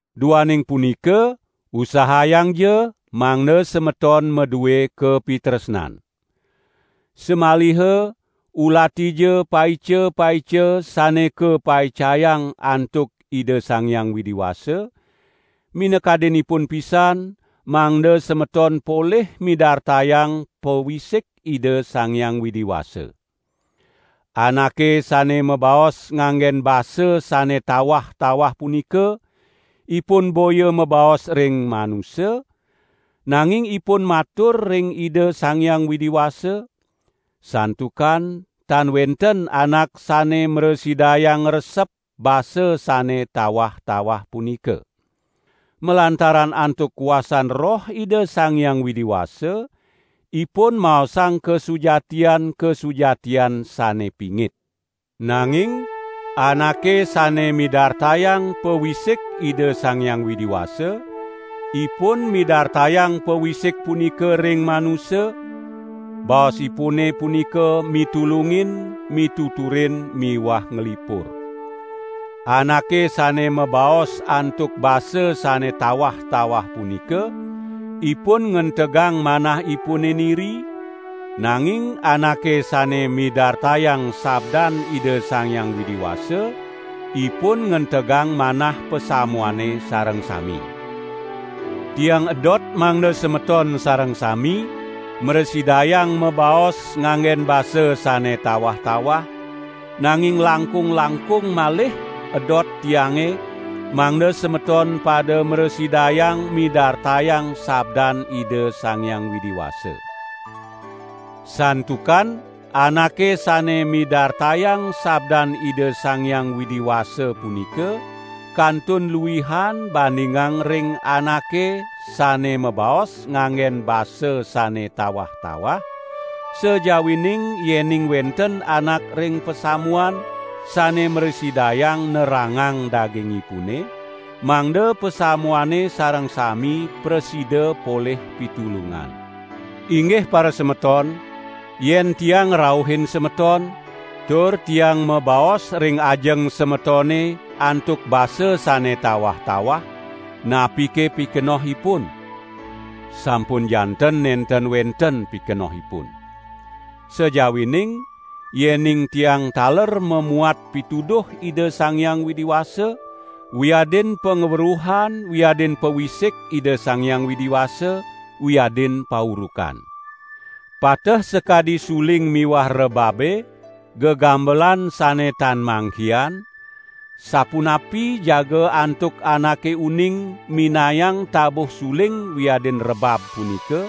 Duaning punika usahayangja mangda semeton madue kapitresnan. Samaliha ulatija paica-paica sane kapaicayang antuk Ida Sang Hyang Widi Wasa, minakadinipun pisan mangda semeton polih midartayang pawisik Ida Sang Hyang Widi Wasa. Anake sane mabaos nganggen basa sane tawah-tawah punika, ipun boya mabaos ring manusa, nanging ipun matur ring Ida Sang Hyang Widi Wasa, santukan tan wenten anak sane mrasidayang ngresep basa sane tawah-tawah punika. Malantaran antuk kuasan Roh Ida Sang Hyang Widi Wasa, ipun maosang kasujatian-kasujatian sane pingit. Nanging anake sane midartayang pawisik Ida Sang Hyang Widi Wasa, ipun midartayang pawisik punika ring manusa, baosipune punika mitulungin, mituturin miwah nglipur. Anake sane mabaos antuk basa sane tawah-tawah punika, ipun ngentegang manahipune niri, nanging anake sane midartayang sabdan Ida Sang Hyang Widi Wasa ipun ngentegang manah pasamuane sareng sami. Tiang edot mangda semeton sareng sami mrasidayang mabaos nganggen basa sane tawah-tawah, nanging langkung-langkung malih edot tiange mangda semeton pada mrasidayang midartayang sabdan Ida Sang Hyang Widi Wasa. Santukan anake sane midartayang sabdan Ida Sang Hyang Widi Wasa punika kantun luihan bandingang ring anake sane mabaos nganggen basa sane tawah-tawah, sajawining yening wenten anak ring pasamuan, sane mrasidayang nerangang dagingipune, mangda pasamuane sareng sami prasida polih pitulungan. Inggih parasemeton, yen tiang ngrauhin semeton, tur tiang mabaos ring ajeng semetone antuk basa sane tawah-tawah, napike pikenohipun? Sampun janten nenten wenten pikenohipun. Sajawining yening tiang taler mamuat pituduh Ida Sang Hyang Widi Wasa, wiadin pangweruhan wiadin pawisik Ida Sang Hyang Widi Wasa, wiadin paurukan. Pateh sakadi suling miwah rebabe, gegambelan sane tan mangkihan, sapunapi jaga antuk anake uning minayang tabuh suling wiadin rebab punika,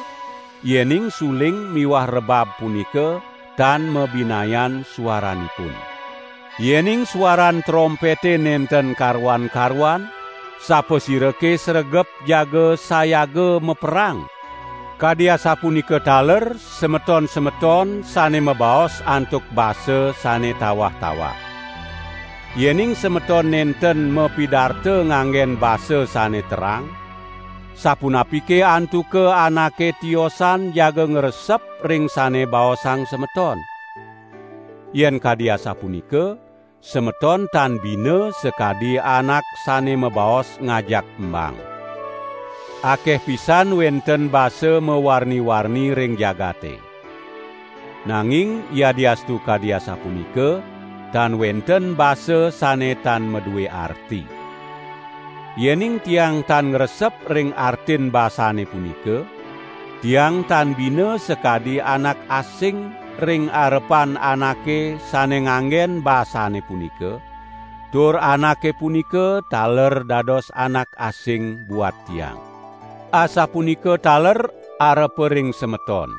yening suling miwah rebab punika tan mabinayan suaranipun. Yening suaran trompete nenten karuan-karuan, sapasirake sregep jaga sayaga maperang? Kadi asapunika taler semeton-semeton sane mabaos antuk basa sane tawah-tawah. Yening semeton nenten mapidarta nganggen basa sane terang, sapunapike antuka anake tiosan jaga ngresep ring sane baosang semeton? Yen kadi asapunika, semeton tan bina sakadi anak sane mabaos ngajak embang. Akeh pisan wenten basa mawarni-warni ring jagate. Nanging yadiastu kadi asapunika, tan wenten basa sane tan madue arti. Yening tiang tan ngresep ring artin basane punika, tiang tan bina sakadi anak asing ring arepan anake sane nganggen basane punika, tur anake punika taler dados anak asing buat tiang. Asapunika taler arepa ring semeton.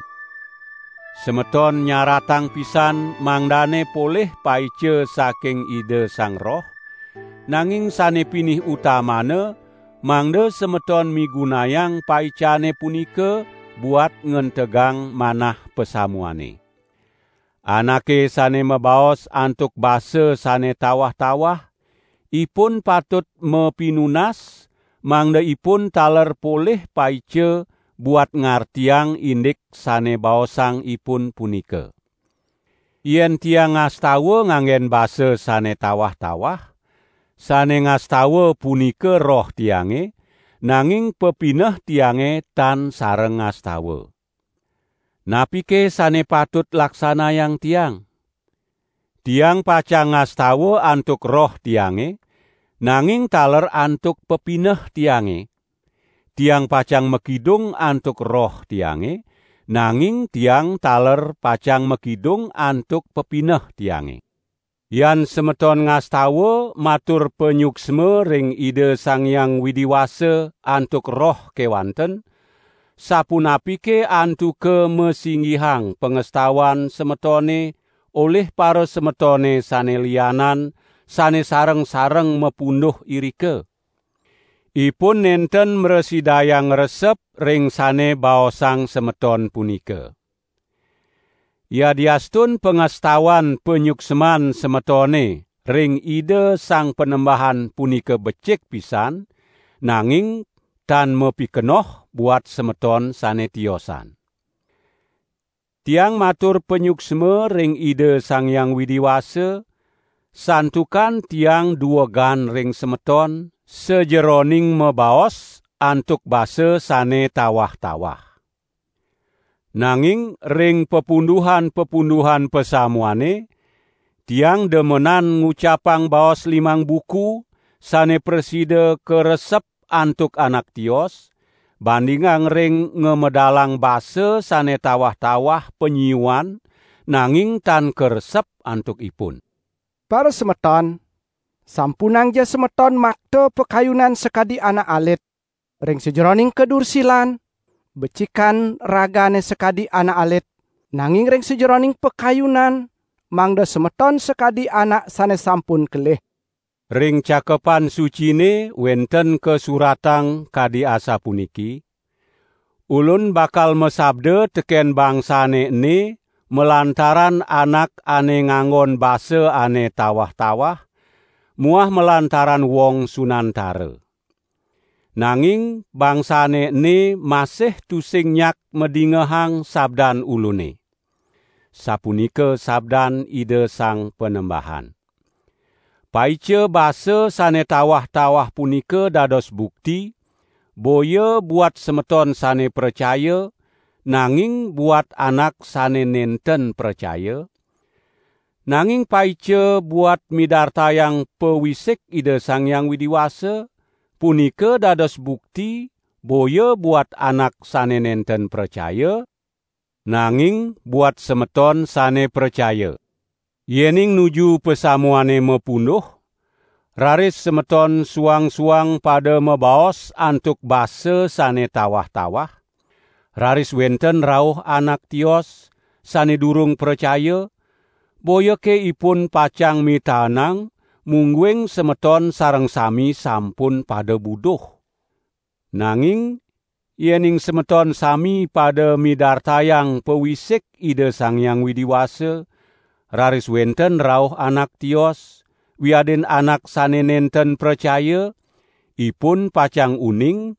Semeton nyaratang pisan mangdane polih paica saking Ida Sang Roh, nanging sane pinih utamana, mangda semeton migunayang paicane punika buat ngentegang manah pasamuane. Anake sane mabaos antuk basa sane tawah-tawah, ipun patut mapinunas mangda ipun taler polih paica buat ngartiang indik sane baosang ipun punika. Yen tiang ngastawa ngangge basa sane tawah-tawah, sane ngastawa punika roh tiange, nanging pepineh tiange tan sareng ngastawa. Napike sane patut laksanayang tiang? Tiang pacang ngastawa antuk roh tiange, nanging taler antuk pepineh tiange; tiang pacang makidung antuk roh tiange, nanging tiang taler pacang makidung antuk pepineh tiange. Yan semeton ngastawa matur panyuksma ring Ida Sang Hyang Widi Wasa antuk roh kewanten, sapunapike antuka masinggihang pangastawan semetone olih parasemetone sane lianan, sane sareng-sareng mapunduh irika? Ipun nenten mrasidayang ngresep ring sane baosang semeton punika. Yadiastun pangastawan panyuksman semetone ring Ida Sang Panembahan punika becik pisan, nanging tan mapikenoh buat semeton sane tiosan. Tiang matur panyuksma ring Ida Sang Hyang Widi Wasa, santukan tiang duegan ring semeton sajeroning mabaos antuk basa sane tawah-tawah. Nanging ring papunduhan-papunduhan pasamuane, tiang demenan ngucapang baos limang buku sane prasida karesep antuk anak tios, bandingang ring ngamedalang basa sane tawah-tawah panyiuan nanging tan karesep antuk ipun. Parasemeton, sampunangja semeton makta pakayunan sakadi anak alit. Ring sajeroning kadursilan, becikan ragane sakadi anak alit, nanging ring sajeroning pakayunan mangda semeton sakadi anak sane sampun kelih. Ring Cakepan Sucine wenten kasuratang kadi asapuniki: "Ulun bakal masabda teken bangsane ene malantaran anak ane nganggon basa ane tawah-tawah, muah malantaran wong sunantara. Nanging bangsane ene masih tusing nyak madingehang sabdan Ulune. Sapunika sabdan Ida Sang Panembahan." Paica basa sane tawah-tawah punika dados bukti, boya buat semeton sane pracaya, nanging buat anak sane nenten pracaya; nanging paica buat midartayang pawisik Ida Sang Hyang Widi Wasa, punika dados bukti boya buat anak sane nenten pracaya, nanging buat semeton sane pracaya. Yening nuju pasamuane mapunduh, raris semeton suang-suang pada mabaos antuk basa sane tawah-tawah, raris wenten rauh anak tios, sane durung pracaya, boyake ipun pacang mitaenang mungguing semeton sareng sami sampun pada buduh? Nanging yening semeton sami pada midartayang pawisik Ida Sang Hyang Widi Wasa, raris wenten rauh anak tios, wiadin anak sane nenten pracaya, ipun pacang uning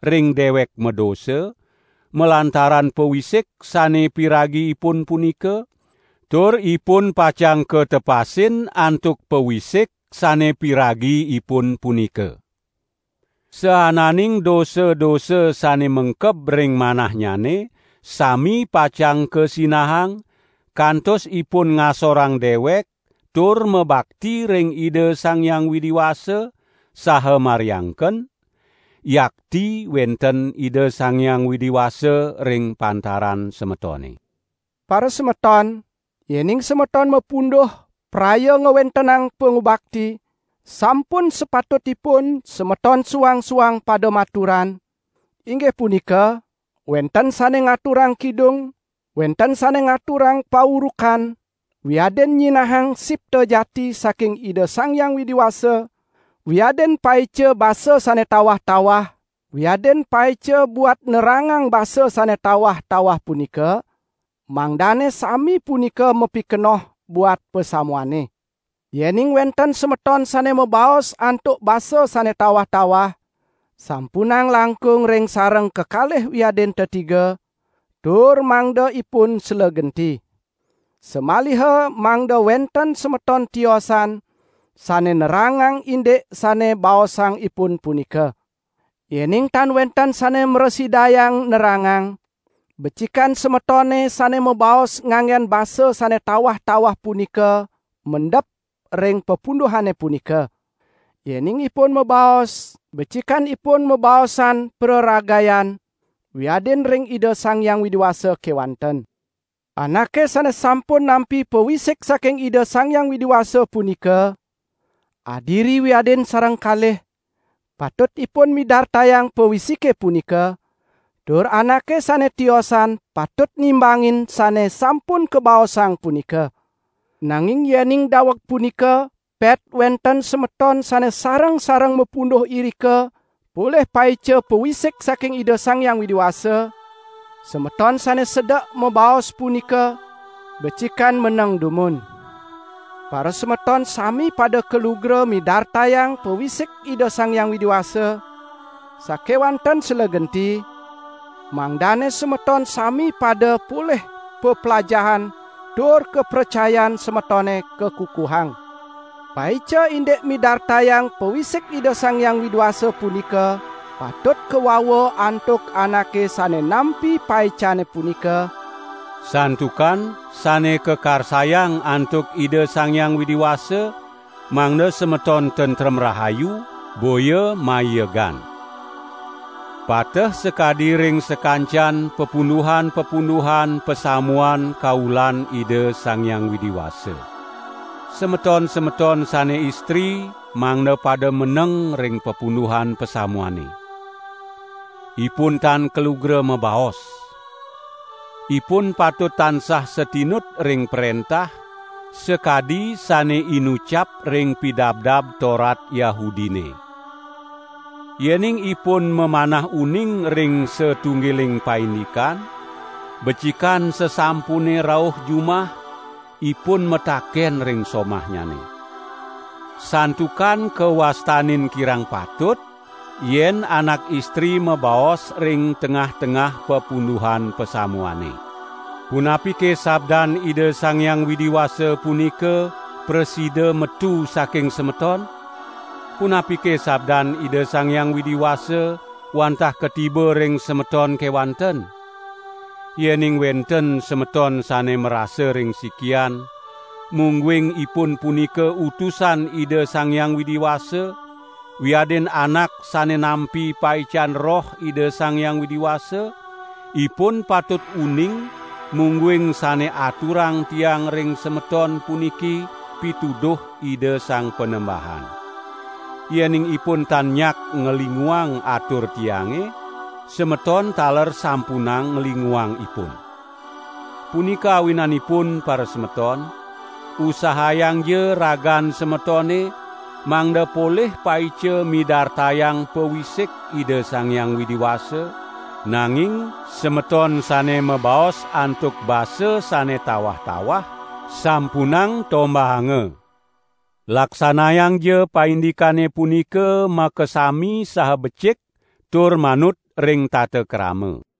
ring dewek madosa malantaran pawisik sane piragi ipun punika, tur ipun pacang katepasin antuk pawisik sane piragi ipun punika. Saananing dosa-dosa sane mengkeb ring manahnyane sami pacang kasinahang, kantos ipun ngasorang dewek tur mabakti ring Ida Sang Hyang Widi Wasa, saha mariangken: "Yakti wenten Ida Sang Hyang Widi Wasa ring pantaran semetone." Parasemeton, yening semeton mapunduh praya ngwentenang pangubakti, sampun sapatutipun semeton suang-suang pada maturan, inggih punika wenten sane ngaturang kidung, wenten sane ngaturang paurukan, wiadin nyinahang sipta jati saking Ida Sang Hyang Widi Wasa, wiadin paica basa sane tawah-tawah wiadin paica buat nerangang basa sane tawah-tawah punika, mangdane sami punika mapikenoh buat pasamuane. Yening wenten semeton sane mabaos antuk basa sane tawah-tawah, sampunang langkung ring sareng kekalih wiadin tetiga, tur mangda ipun slegenti. Samaliha mangda wenten semeton tiosan sane nerangang indik sane baosang ipun punika. Yening tan wenten sane mrasidayang nerangang, becikan semetone sane mabaos nganggen basa sane tawah-tawah punika mendep ring papunduhane punika. Yening ipun mabaos becikan ipun mabaosan praragayan, wiadin ring Ida Sang Hyang Widi Wasa kewanten. Anake sane sampun nampi pawisik saking Ida Sang Hyang Widi Wasa punika, adiri wiadin sareng kalih, patut ipun midartayang pawisike punika, tur anake sane tiosan patut nimbangin sane sampun kabaosang punika. Nanging yening daweg punika pet wenten semeton sane sareng-sareng mapunduh irika polih paica pawisik saking Ida Sang Hyang Widi Wasa, semeton sane sedek mabaos punika becikan meneng dumun. Parasemeton sami pada kalugra midartayang pawisik Ida Sang Hyang Widi Wasa, sakewanten slegenti, mangdane semeton sami pada polih peplajahan tur kapracayan semetone kakukuhang. Paica indik midartayang pawisik Ida Sang Hyang Widi Wasa punika patut kawawa antuk anake sane nampi paicane punika, santukan sane kakarsayang antuk Ida Sang Hyang Widi Wasa mangda semeton tentrem rahayu, boya maiegan. Pateh sakadi ring sakancan papunduhan-papunduhan pasamuan kaulan Ida Sang Hyang Widi Wasa. Semeton-semeton sane istri mangda pada meneng ring papunduhan pasamuane. Ipun tan kalugra mabaos. Ipun patut tansah satinut ring prentah, sakadi sane inucap ring Pidabdab Torat Yahudine. Yening ipun mamanah uning ring satunggiling paindikan, becikan sasampune rauh jumah, ipun mataken ring somahnyane. Santukan kawastanin kirang patut yen anak istri mabaos ring tengah-tengah papunduhan pasamuane. Punapike sabdan Ida Sang Hyang Widi Wasa punika prasida metu saking semeton? Punapike sabdan Ida Sang Hyang Widi Wasa wantah katiba ring semeton kewanten? Yening wenten semeton sane marasa ring sikian, mungguing ipun punika utusan Ida Sang Hyang Widi Wasa wiadin anak sane nampi paican Roh Ida Sang Hyang Widi Wasa, ipun patut uning mungguing sane aturang tiang ring semeton puniki pituduh Ida Sang Panembahan. Yening ipun tan nyak nglinguang atur tiange, semeton taler sampunang nglinguang ipun. Punika awinanipun parasemeton, usahayangja ragan semetone mangda polih paica midartayang pawisik Ida Sang Hyang Widi Wasa, nanging semeton sane mabaos antuk basa sane tawah-tawah sampunang tombahanga. Laksanayangja paindikane punika makasami saha becik tur manut ring tata krama.